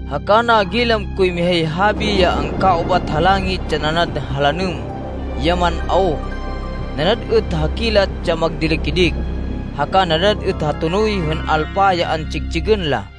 Haka nagilam koy mihay habi ya angkaubat ha langit ya nanad ha lanêm ya man-awk, nanad êt ha kilat ya magdili-kidik, haka nanad êt ha tonoy hên alpa ya antsig-tsigên la.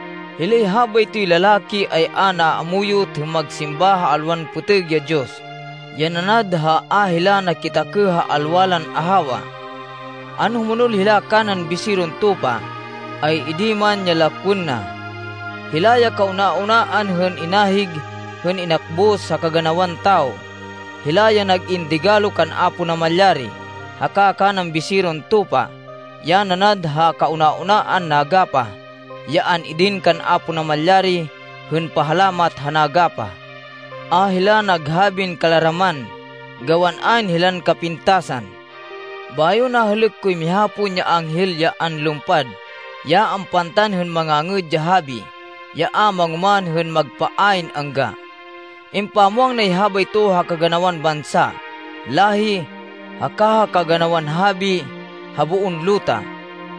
Hilay habaytoy lalaki ay a naamuyot hên magsimba ha alwan pêtêg ya diyos, ya nanad ha a hila nakitakêh ha alwa lan ahawa. Anhumonol hila kanan Biseron Tupa, ay idi man ya lakwên na. Hila ya kauna-unaan hên inahig, hên inakbus ha kaganawan tawo. Hila ya nag-in digalo kan Apo Namalyari haka kanan Biseron Tupa, ya nanad ha kauna-unaan nagapah, ya an-idin kan Apo Namalyari hên pahalamat ha nagapah. A hila naghabin kalaraman, gawan ayn hilan kapintasan. Bayo nahêlêk koy miha pon ya anghel ya anlumpad ya ampantan hên mangangêd ya habi ya a mangoman hên magpa ayn angga. Impamwang nay habayto ha kaganawan bansa, láhi, haka ha kaganawan habi ha boon luta.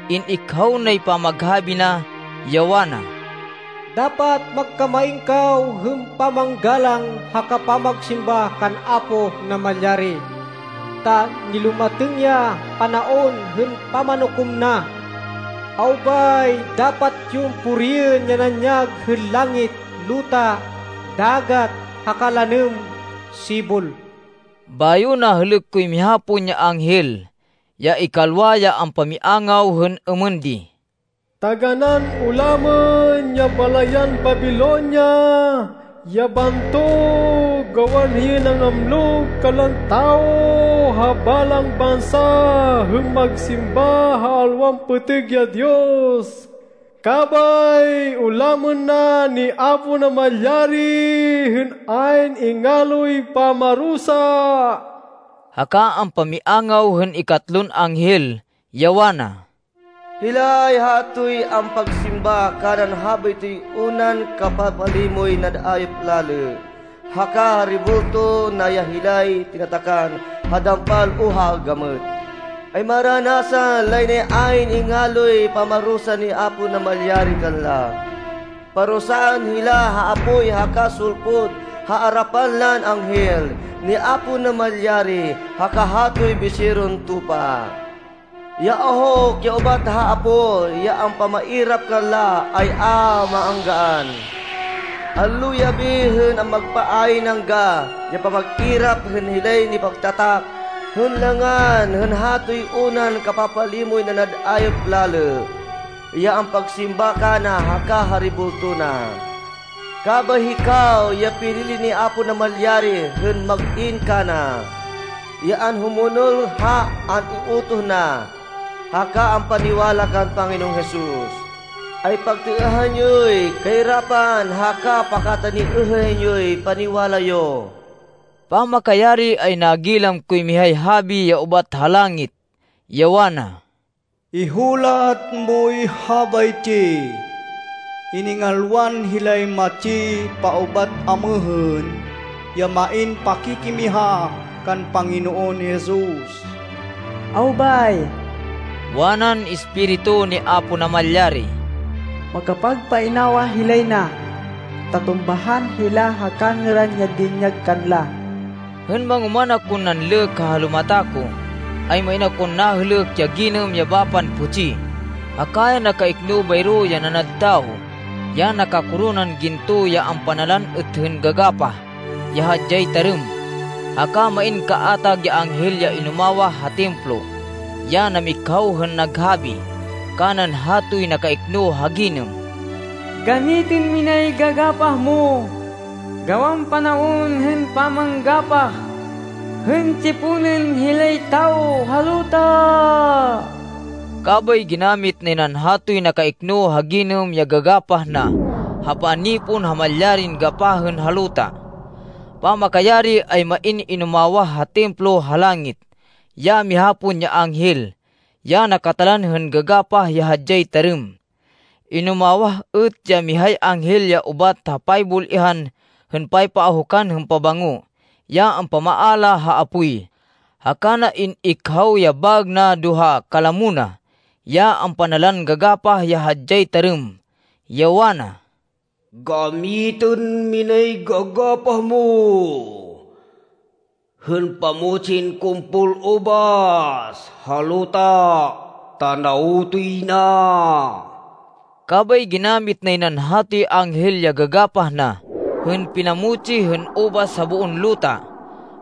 In-ikhaw nay pamaghabi na, ya wana, “Dapat magkamain kaw hên pamanggalang haka pamagsimba kan Apo Namalyari, ta nilumatêng ya panaon hên pamanukom na. Awbay, dapat yon puriên ya nanyag hên langit, luta, dagat, haka lanêm sibol!” Bayo nahêlêk koy miha pon ya anghel, ya ikalwa, ya ampamiangaw hên êmên di, “Taganán ulamên ya balayan Babilonia, ya bantog, gawan hiyay nangamlug kanlan tawo ha balang bansa hên magsimba ha alwan pêtêg ya diyos, kabay ulamên na ni Apo Namalyari hên ayn ingaloy pamarusa.” Haka ampamiangaw hên ikatatlon anghel, ya wana, “Hilay hatoy ampagsimba kanan habaytoy unan kapapalimoy nanad ayop lalê, haka ha rebulto na, ya hilay tinatakan ha dampal o ha gamêt, ay maranasan lay nay ayn ingaloy pamarusa ni Apo Namalyari kanla. Parusaan hila ha apoy haka sulpud ha arapan lan anghel ni Apo Namalyari, haka hatoy Biseron Tupa. Ya ahuk ya ubat ha apoy ya ampamairap kanla ay a maanggaan. Allo yabi hên magpa ayn angga ya pamag-irap hên hilay nipagtatak hên langan hên hatoy unan kapapalimoy nanad ayop lalê, ya ampagsimba kana haka ha rebulto na.” Kabay hikaw ya pinili ni Apo Namalyari hên mag-in kana, ya anhumonol ha an-iutoh na, haka ampaniwala kan Panginoon Jesus, ay pagtêêhan yoy kairapan haka pakataniêhên yoy paniwala yo. Pamakayari ay nagilam koy mihay habi ya ubat ha langit, ya wana, “Ihulat moy habaytsi: Iningalwan hilay matsi paubat amêhên, ya main pakikimiha kan Panginoon Jesus.” “Awbay!” wanan Espiritu ni Apo Namalyari. “Makapagpainawa hilay na ta tumbahan hila ha kangêran ya dinyag kanla.” Hên mangoman akon nanlêk ha halumata ko, ay main akon nahêlêk ya ginêm ya bapan putsi, haka ya nakaikno bayro ya nanad tawo, ya nakakoronan ginto, ya ampanalan êt hên gagapah ya hadyay tarêm. Haka main kaatag ya anghel ya inumawah ha Templo ya namikhaw hên naghabi kanan hatoy nakaikno ha ginêm, “Gamitên minay gagapah mo gawan panaon hên pamanggapah hên tsiponên hilay tawo ha luta.” Kabay ginamit nay nan hatoy nakaikno ha ginêm ya gagapah na ha panipon ha malyarin gapahên ha luta. Pamakayari, ay main inumawah ha Templo ha langit ya miha pon ya anghel ya nakatalan hên gagapah ya hadyay tarêm. Inumawah êt ya mihay anghel ya ubat ha paybul-ihan hên paypaahukan hên pabango, ya ampamaala ha apoy, haka na in-ikhaw ya baêg na do ha kalamo na ya ampanalan gagapah ya hadyay tarêm, ya wana, “Gamitên minay gagapah mo hên pamutsin kumpol ubas ha luta ta nawtoy na.” Kabay ginamit nay nan hatoy anghel ya gagapah na hên pinamutsi hên ubas ha boon luta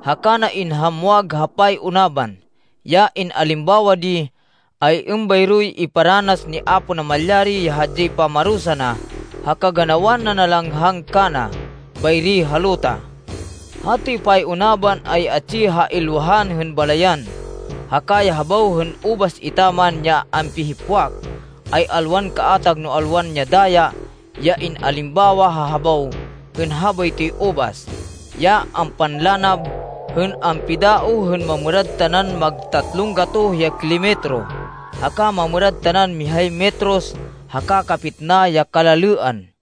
haka na inhamwag ha pay-unaban. Ya in-alimbawa di, ay êmbayroy iparanas ni Apo Namalyari ya hadyay pamarusa na ha kaganawan nanalanghang kana bayri ha luta. Hatoy pay-unaban ay atsi ha ilwahan hên balayan, haka ya habaw hên ubas etaman ya ampihipwak, ay alwan kaatag no alwan ya daya ya in-alimbawa ha habaw hên habaytoy ubas, ya ampanlanab hên ampidaoh hên mamêrad tanan mag tatlon gatoh ya kilometro haka mamêrad tanan mihay metros haka kapitna ya kalalêan.